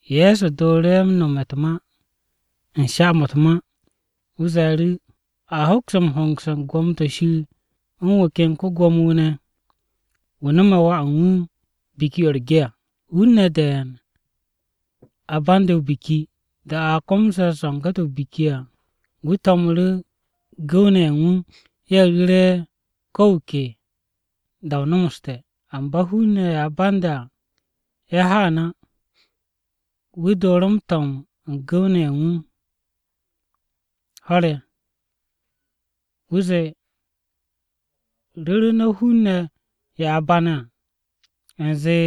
Ye̱so dooru̱ ye̱ m-nome̱ u̱t-ma u̱n sha-mo̱ u̱t-ma. Wu̱ ze̱e̱ru̱, “A hoks m-hongse̱ u̱n gwo̱mo-to̱ Shir u̱n wu̱ ken Ko-Gwo̱mo-wu̱ ne̱, wu̱ nome̱ wà u̱n wu̱ biki-o̱ u̱t-ge à. Hun-ne̱ de̱e̱n a bande̱ o-biki. Da-o̱ a ko̱me̱ zo̱nge̱-to̱ o-biki à, wu̱ to̱mu̱ru̱ gu̱w-ne̱ ye̱ u̱n wu̱ ye̱ ru̱re̱ ko̱ wu̱ ke da-o nomoste̱. Amba hun-ne̱ ye̱ a bande̱ à ye̱ haan á. “Wu̱ dooru̱ m-to̱m u̱n gu̱w-ne̱ ho̱r-ye̱. Wu̱ zee, ‘Ru̱ru̱ no̱ hun-ne̱ ye̱ a bane̱ à u̱nze,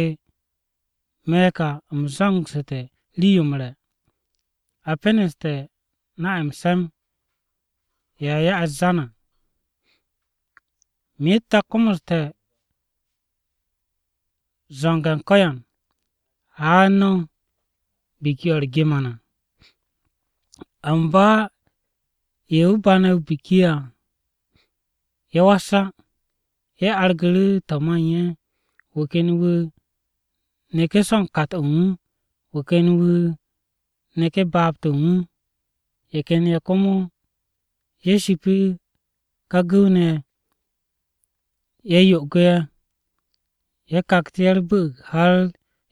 “Me̱ ka u̱m zo̱ngsu̱te̱ rii-yo m-re̱, a peneste̱ na-ye̱ m-se̱m ye̱ a ya'e̱ u̱t-zan à. Myet a komoste̱ zo̱nge̱ u̱n ko̱yan. Haan no̱ biki-o̱ u̱r-ge ma na!” ’ “Amba ye̱ wu̱ bane̱ o-biki à ye̱ was á. Ye̱ argu̱ru̱ to̱ ma u̱n ye̱. Wu̱ ken wu̱ neku̱ so̱ u̱n kat-o̱ u̱n wu̱. Wu̱ ken wu̱ neku̱ baab-to̱ u̱n wu̱. Ye̱ ken ye̱ komo ye̱ shipi ká gu̱w-ne̱ ye̱, ye̱ yo'ogu̱ ye̱, ye̱ kaktu̱ ye̱ u̱r-bu̱'u̱g, har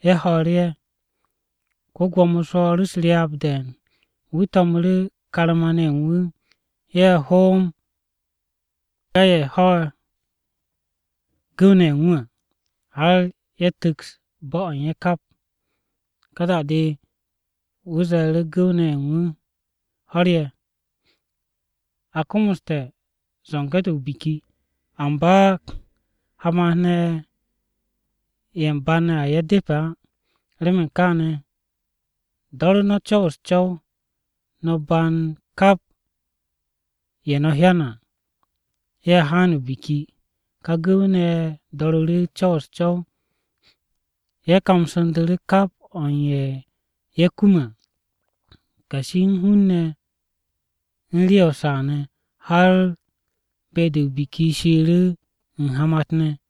ye̱ ho̱o̱ru̱ ye̱. “Ko-Gwo̱mo swo̱o̱ru̱ u̱s-ryaab de̱e̱n. Wu̱ to̱mu̱ru̱ karma-ne̱ ye̱ u̱n wu̱. Ye̱ hoomu̱ wu̱ ká ye̱ ho gu̱w-ne̱ ye̱ u̱n wu̱ à, har ye̱ tu̱ks bo̱-o̱ u̱n ye̱ kap. “Ka da-de, wu̱ ze̱e̱ru̱ gu̱w-ne̱ ye̱ u̱n wu̱ ho̱r-ye̱, ‘A komoste̱ zo̱nge̱-to̱ o-biki, amba hamat-ne̱ ye̱ u̱m bane̱ à ye̱ depe̱ á. Remen kaane̱, do̱ru̱ no̱ co̱w u̱s-co̱w, no̱ band kap ye̱ no̱ hyane̱ à ye̱ haan o-biki.’ Ká gu̱w-ne̱ ye̱ do̱ru̱ru̱ co̱w u̱s-co̱w. Ye̱ kamsu̱ndu̱ru̱ kap o̱ u̱n ye̱, ye̱ kume̱ à, kashi u̱n hun-ne̱ u̱n rii-ye̱ o-saa ne̱, har be-de o-biki shiiru̱ u̱n hamat-ne̱.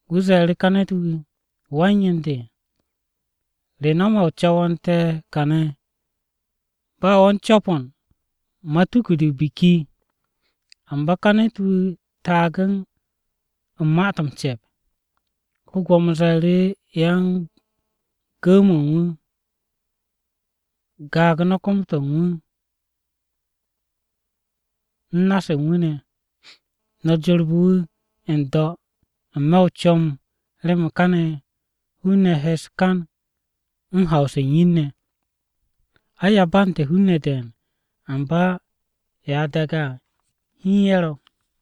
Wu̱ ze̱e̱ru̱ ká ne̱t-wu̱, ‘Wan-yen de, ¿re no̱me̱ o co̱wo̱nte̱ kane̱ ba wo̱ u̱n co̱po̱n matuku-de o-biki?’ Amba ká ne̱t-wu̱ taage̱ u̱n ma-to̱ m-ce̱p. Ko-Gwo̱mo ze̱e̱ru̱ yan-gu̱w-mo̱ u̱n wu̱, ‘Gaag no̱ kom-to̱ u̱n wu̱ u̱n na-se u̱n wu̱ ne̱. No̱ jorbe̱ wu̱ n-do̱ n-me̱ o-comb, remen káne̱ hun-ne̱ he u̱s-kan u̱n haw-se u̱n yin-ne̱.’ “Ai, a bante̱ hun-ne̱ de̱e̱n, amba ye̱ a daage̱ à hiin ye̱ ro̱.”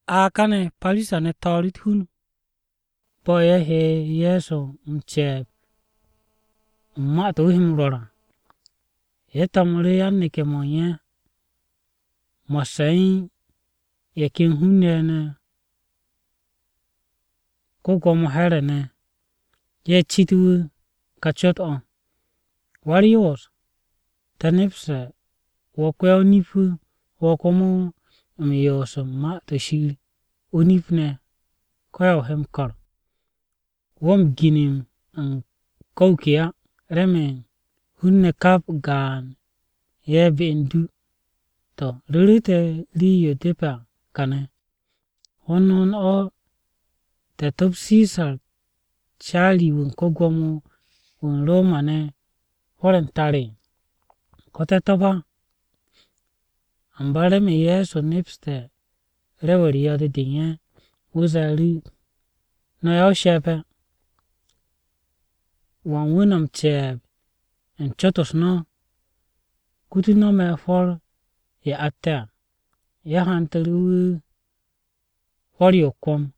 A kane̱ Parisa-ne̱ haaru̱, ye̱ to̱o̱ru̱ u̱t-hun bo̱ ye̱ he Ye̱so m-ce̱e̱b u̱n ma-to̱ wu̱ he m-rwo̱r à. Ye̱ to̱mu̱ru̱ yan-neke̱-mo̱ u̱n ye̱, mo̱sse̱ u̱n ye̱ ken hun-ne̱ Ko-Gwo̱mo Here̱ ye̱ ne̱. Ye̱ cit wu̱ kà cot-o̱, “Wa-u̱r-Yoos, te̱ nepste̱ wo̱ ko-ya-o-nip-wu̱. Wo̱ komo m-yoos u̱n Ma-to̱ Shir o-nip ne̱ ko̱ ya he m-ko̱r. Wo̱ m-ginim u̱n ko̱ wu̱ ke á, remen hun-ne̱ kap gaan-ye̱ be u̱n du. To̱, ru̱ru̱ te̱ rii-yo depe̱ à kane̱: ¿Hond hond o̱ te̱ to̱p Sisar caari-wu̱ u̱n ko-Gwo̱mo-wu̱ u̱n Roma-ne̱ hwo̱r-ye̱ u̱n tar? ¿Ko̱ te̱ to̱p á?” Amba remen Ye̱so nepste̱ rew-u̱r yo̱-de de u̱n ye̱, wu̱ ze̱e̱ru̱, “No̱ ya-o-she̱pe̱! ¿Wan wu̱ no̱ m-ce̱e̱b u̱n cot-u̱s no̱? Kutu no̱ me̱ hwo̱r-ye̱ atte̱ à.” Ye̱ hantu̱ru̱ wu̱ hwo̱r-yo o-kwo̱m.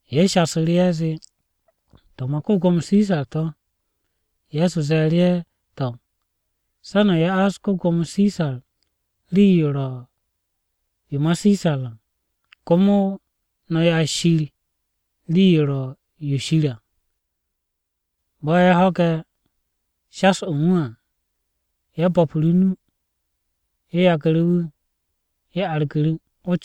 Ye̱ shasu̱ru̱ ye̱ zee, “To̱ ma ko-Gwo̱mo Sisar to̱.” Ye̱so ze̱e̱ru̱ ye̱, “To̱, se̱ no̱ ya'as ko-Gwo̱mo Sisar rii-yo ro̱ yo ma Sisar à, komo no̱ ya'as Shir rii-yo ro̱ yo Shir à.” Bo̱ ye̱ ho̱gu̱te̱ shas-o̱ u̱n wu̱ à, ye̱ bo̱pu̱ru̱ o-nu. Ye̱ yagu̱ru̱ wu̱, ye̱ argu̱ru̱.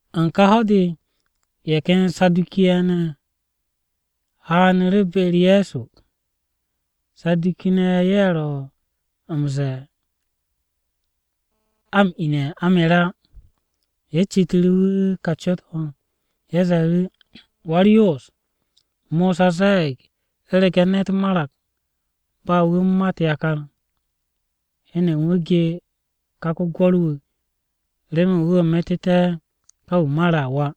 U̱n ká ho̱-de, ye̱ ken Saduki-ne̱ ye̱ haanu̱ru̱ be-u̱r Ye̱so. (Saduki-ne̱ ye̱ ro̱ m-ze̱e̱ a m-ine̱ a mere̱ á). Ye̱ citu̱ru̱ wu̱ kà cot-o̱. Ye̱ ze̱e̱ru̱, “Wa-u̱r-Yoos, Mosa ze̱e̱g, ‘U̱rege̱ ne̱t marag ba wu̱ u̱n mat yakar, heno u̱n wu̱ ge ká ko-gwo̱r-wu̱, remen wu̱ metu̱té̱ ká wu̱ mare̱ à wà,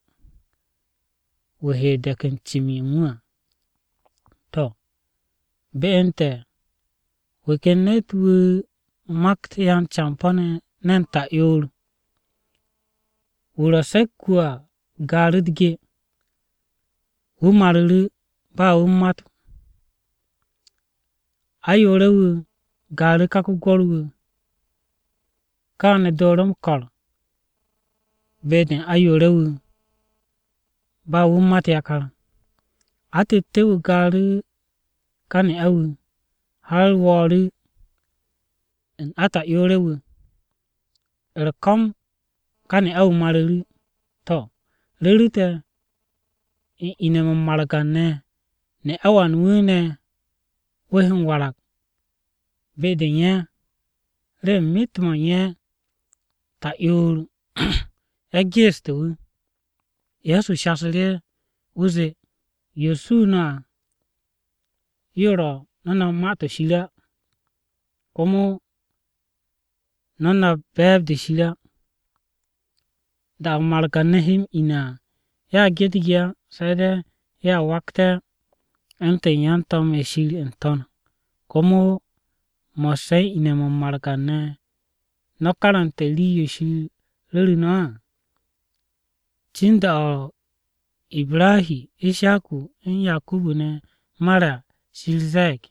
wu̱ he de̱k u̱n cim-yo u̱n wu̱ à.’ To̱, be u̱n te̱ wu̱ ken ne̱t-wu̱ makt yan-campo̱-ne̱ ne̱n ta'yoor. Wu̱ ro̱ se̱k-wu̱ a gaaru̱ u̱t-ge, wu̱ maru̱ru̱ ba wu̱ u̱n mat. Ayoore̱-wu̱ gaaru̱ ká ko-gwo̱r-wu̱. Káane̱ dooru̱ m-ko̱r be-de u̱n ayoore̱-wu̱ ba wu̱ u̱n mat yakar. Atette̱-wu̱ gaaru̱ ká ne'a-wu̱, har wo̱o̱ru̱ u̱n ata'yoore̱-wu̱. U̱r-ko̱m, ká ne'a-wu̱ maru̱ru̱. To̱, ru̱ru̱ te̱ u̱n ine̱-mo̱ u̱n margan-ne̱, ¿ne'a wan wu̱ ne̱ wu̱ he m-warag be-de u̱n ye̱? Remen myet-mo̱ u̱n ye̱, ta'yoor-ye̱ geestu̱ wu̱!” Ye̱so shasu̱ru̱ ye̱, wu̱ zee, “Yo suu no̱ à yo ro no̱ nap Ma-to̱ Shir á. Komo no̱ nap be̱e̱b-de Shir á. Da-o̱ margan-ne̱ he m-ine̱ à, ye̱a ge u̱t-ge á. Se̱ de̱ ye̱a wakte̱ u̱ntu̱n yan-to̱m-ye̱ Shir n-To̱n. “Komo mo̱sse̱ u̱n ine̱-mo̱ u̱n margan-ne̱, ¿no̱ karante̱ rii-yo Shir ru̱ru̱ no̱ á? Cin da-o̱ Ibrahi, Ishaku, u̱n Yakubu ne̱ mare̱ à Shir ze̱e̱g,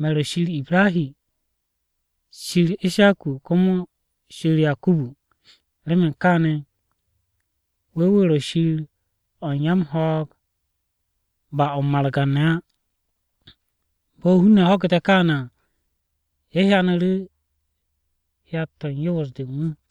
‘Me̱ ro̱ Shir Ibrahi, Shir Ishaku, komo Shir Yakubu.’ Remen kaane̱, wu̱ wu̱ ro̱ Shir o̱ u̱n ya-m-ho̱o̱g, ba o̱ u̱n margan-ne̱ á.” Bo̱ hun-ne̱ ho̱gu̱te̱ káane̱ à, ye̱ hyanu̱ru̱ hyat-to̱ u̱n yoos-de u̱n wu̱.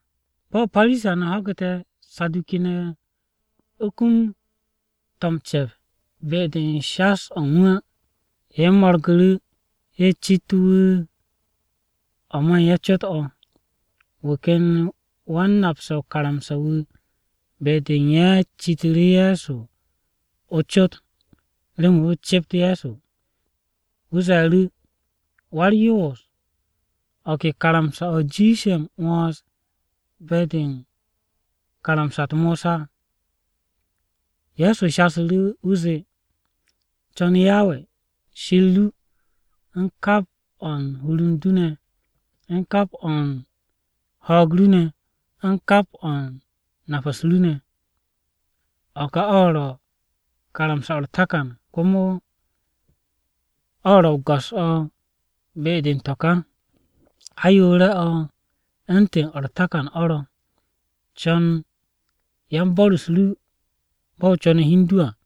Bo̱ Parisa-ne̱ ho̱gu̱te̱ Saduki-ne̱ kum to̱ m-ce̱p be-de u̱n shas-o̱ u̱n wu̱ á, ye̱ mo̱rgu̱ru̱. Ye̱ cit wu̱ o̱ ma u̱n ye̱ cot-o̱. Wu̱ ken wan-napse̱ o-karamsa wu̱ be-de u̱n ye̱ citu̱ru̱ Ye̱so o-cot remen wu̱ cept Ye̱so. Wu̱ ze̱e̱ru̱, “Wa-u̱r-Yoos, ¿o̱ ke karamsa-o̱ jiishe̱ m-'wo̱ns be-de u̱n karamsa-u̱t Mosa?” Ye̱so shasu̱ru̱, wu̱ zee, “Co̱n Yawe Shir ru u̱n kap o̱ u̱n hur u̱n du, u̱n kap o̱ u̱n ho̱o̱g ru ne̱, u̱n kap o̱ u̱n nap-u̱s ru ne̱. O̱ ka o̱ ro̱ karamsa-o̱ u̱r-takan, komo o̱ ro̱ o-go̱s o̱ be-de u̱n to̱ ká. Ayoore̱-o̱ u̱ntu̱n o̱ u̱r-takan o̱ ro̱, ‘Co̱n yan-bo̱r-u̱s ru bo̱ o co̱ne̱ hi u̱n du à.’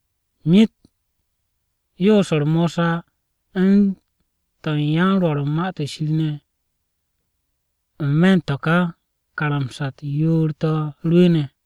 Myet yoos-u̱r Mosa u̱n to̱ u̱n yan-Rwo̱r u̱n Ma-to̱ Shir ne̱, n-me̱ u̱n to̱ ká karamsa-u̱t yoor-to̱ rwu̱u̱ne̱.”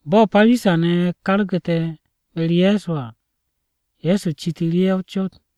Bo̱ Parisa-ne̱ kargu̱te̱ be-u̱r Ye̱so à, Ye̱so citu̱ru̱ ye̱ o-cot.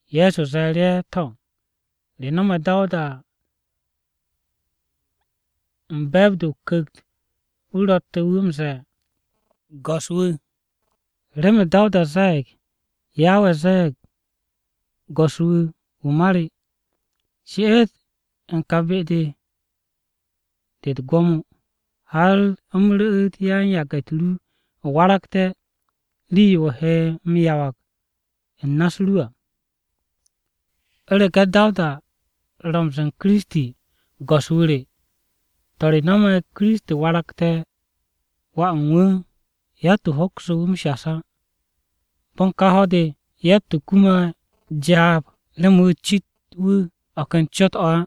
Ye̱so ze̱e̱ru̱ ye̱, “To̱, ¿re no̱me̱ Dawuda u̱n be̱e̱b-de o-Ku̱kt, wu̱ ro̱tte̱ wu̱ m-ze̱e̱ ‘Go̱s-wu̱’? Remen Dawuda ze̱e̱g, “ ‘Yawe ze̱e̱g Go̱s-wu̱ wu̱ ma re, “She'et u̱n ka be-de u̱t-gwo̱mo de, har u̱m ru̱'u̱t yan-yage̱-u̱t ru waragte̱ rii-yo o he m-yawag u̱n na-u̱s ru à.” ’ ¿U̱rege̱ Dawuda ro̱ m-ze̱e̱ u̱n Kiristi, ‘Go̱s-wu̱ re,’ to̱, re no̱me̱ Kiristi waragte̱ wà u̱n wu̱?” Yatt-wu̱ hoksu̱ wu̱ m-shas á. Bo̱ u̱n ká ho̱-de yatt-wu̱ kume̱ jaab remen wu̱ cit wu̱ o̱ ken cot-o̱ á.